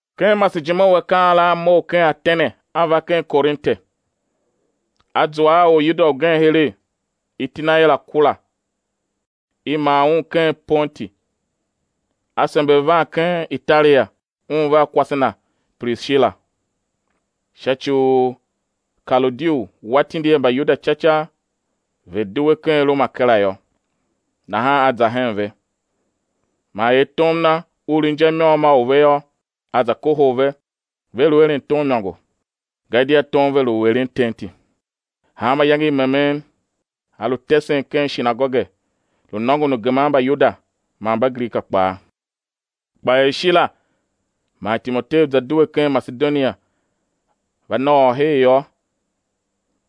Ken masejime u akaa la a mough ken Atene a va ken Korinte. A zua a Oryuda ugen heregh, iti na er Akula, i mar un ken Pontu, a sember van ken Italia, un vea kwase na Prishila, sha ci u Kaloudiu wa tindi er Mbayuda ca ca ve̱ due ken Roma kera yô. Nahan a za hen ve. Man er tom na u lu inja i môm a u ve yô, a za kohol ve, ve lu eren tom imôngo, gadia tom ve lu u eren tenti. Hanma iyange i memen a lu tesen ken shinagoge, lu nôngon u geman Mbayuda man Mbagrika kpaa. Kpa er Shila man Timoteu za due ken Masedonia, va nôôr her yô,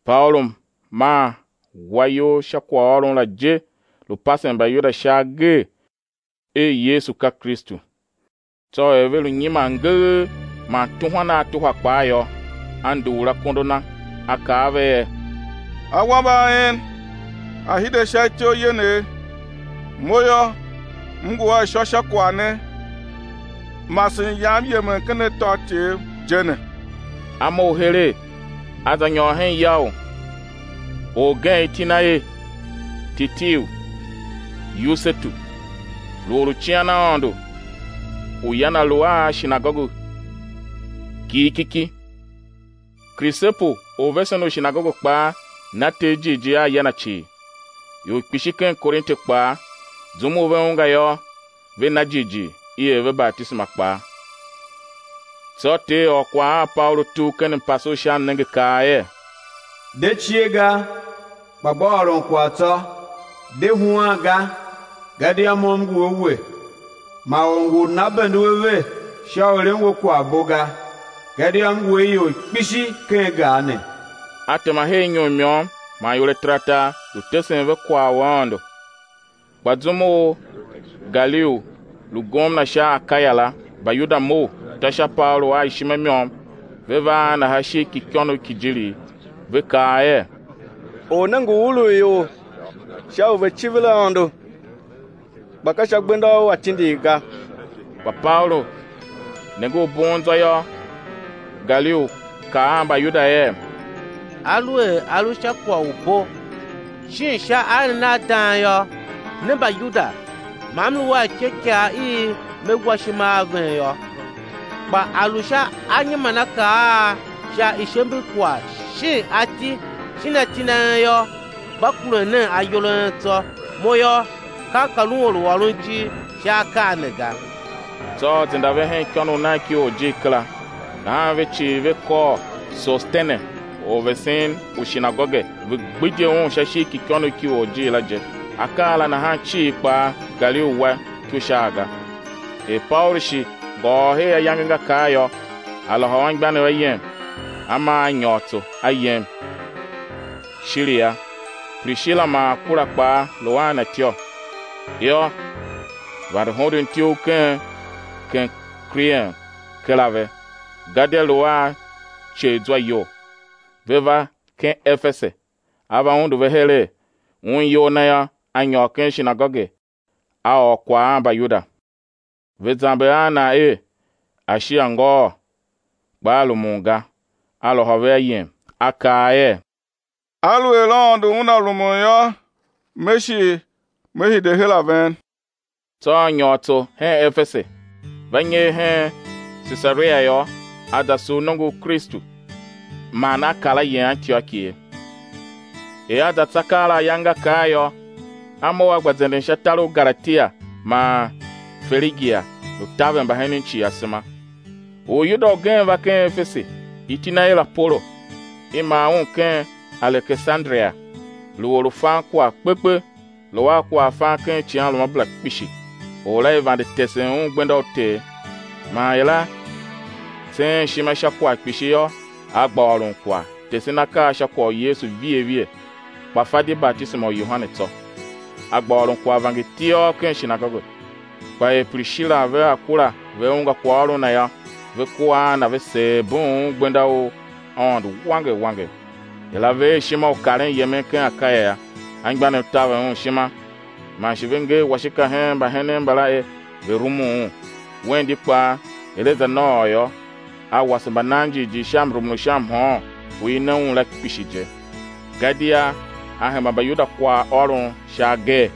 Paulu maa wa iyol sha kwaghôron la je lu pasen Mbayuda sha agee er Yesu ka Kristu. Tsô er ve lu nyiman ngegh, man tuhwan a tuhwa kpaa yô, a nduur akondo na, a kaa a ve er: Awambe a en a̱ hide sha ityough yenegh; mo yô, m ngu a ishô sha kwagh ne; masen yam yemen ken atôatyev je ne. A mough heregh a za nyôr hen ya u orgen iti na er: Titiu Yusetu, lu or u cian Aôndo u ya na lu a shinagoge kighikiki. Krisepu, orvesen u shinagoge kpaa na Ter jighjigh a ya na cii; ior kpishi ken Korinte kpaa, zum u ve ungwa yô, ve na jighjigh i er ve batisema kpaa. Tsô Ter ôr kwagh a Paulu tugh ken mpase u sha mnenge kaa er: De cie ga, kpa gba ôron kwagh tsô, de huan ga; gadia Mo M ngu a we, ma or ngu u nana bende u ave sha u eren we kwagh u bo ga, gadia M ngu a ior kpishi ken gar ne. A tema her inyom i môm man iwer ataratar, lu tesen ve kwaghôron u Aôndo. Kpa zum u Galiou lu gomna sha Akaya la, Mbayuda mough, ta sha Paulu a ishima i môm ve va a na sha ishigh ki ikônough ki ijirigh, ve kaa er: Or ne ngu urugh ior sha u ve̱ civir Aôndo, kpa ka sha gbenda u atindigh ga. Kpa Paulu nenge u una bugh zwa yô, Galiou kaa a Mbayuda er: Aluer a lu sha kwagh u bo shin sha aeren a dang yô, ne Mbayuda, ma m lu a ityôikaa i me wa ishima a ven yô. Kpa a lu sha anyimanakaa a sha ishemberkwagh shin ati shin atindi a en yô, gba kuren nen ayol a en tsô, mo yô, kam ka lun or u ôron ijir sha akaa ne ga. Tsô a zenda ve hen ikônough nagh ki orjir kera. Nahan ve cii ve kôr Sosetene, orvesen u shinagoge, ve gbidye un sha ishigh ki ikônough ki orjir la je. Akaa la nahan cii kpaa, Galiou wa iko sha a ga. Er Paulu shi ngôôr her ayange nga kar yô, a lôhô anmgbianev ayem, a maa a nyôr tso, a yem Shiria; Prishila man Akula kpaa lu a na ityô; yô, vande hondon ityough ken Kenkrien kera ve, gadia lu a iceghzwa iyol. Ve va ken Efese; a va undu ve heregh, un iyol na yô, a nyôr ken shinagoge a ôr kwagh a Mbayuda. Ve zamber a na er a̱ shi a̱ ngôôr, kpa a rumun ga; a lôhô ve ayem a kaa er: Aluer Aôndo Una rumun yô, me shi me hide her a ven. Tsô a nyôr tso hen Efese. Va nyer hen Sesaria yô, a za sugh nongo u Kristu, man a kar a yem Antioki ye. Er a za tsa keela ayange nga kar yô, a mough a gba zenden sha tar u Galatia man Ferigia, lu taver mbahenen cii asema. Oryuda ugen va ken Efese, iti na er Apolo, i mar un ken Alekesanderia, lu or u fan kwagh kpe kpe, lu a kwaghfan ken icighanruamabera kpishi. Or la i vande tesen un gbenda u Ter; man er a tseen ishima sha kwagh kpishi yô, a gba ôron kwagh, tesen akaa sha kwagh u Yesu vighe vighe, kpa fa di batisema u Yohane tsô. A gba ôron kwagh vangertiôr ken shinagoge. Kpa er Prishila vea Akula ve ungwa kwaghôron na yô, ve kua a na, ve seer bughun un gbenda u Aôndo wanger wanger. Er a ver ishima u karen yemen ken Akaya yô, anmgbianev taver un ishima, man shi ve nger washika hen mbahenen mbala er ve̱ rumun un. Wen di kpaa, er a za nôôr yô, a wase mbananjighjigh sha mrumun u sha mhôôn u i ne un la kpishi je. Gadia a hemba Mbayuda kwaghôron sha agee,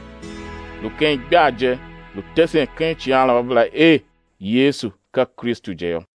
lu ken igbar je, lu tesen ken icighanruamabera er Yesu ka Kristu je yô.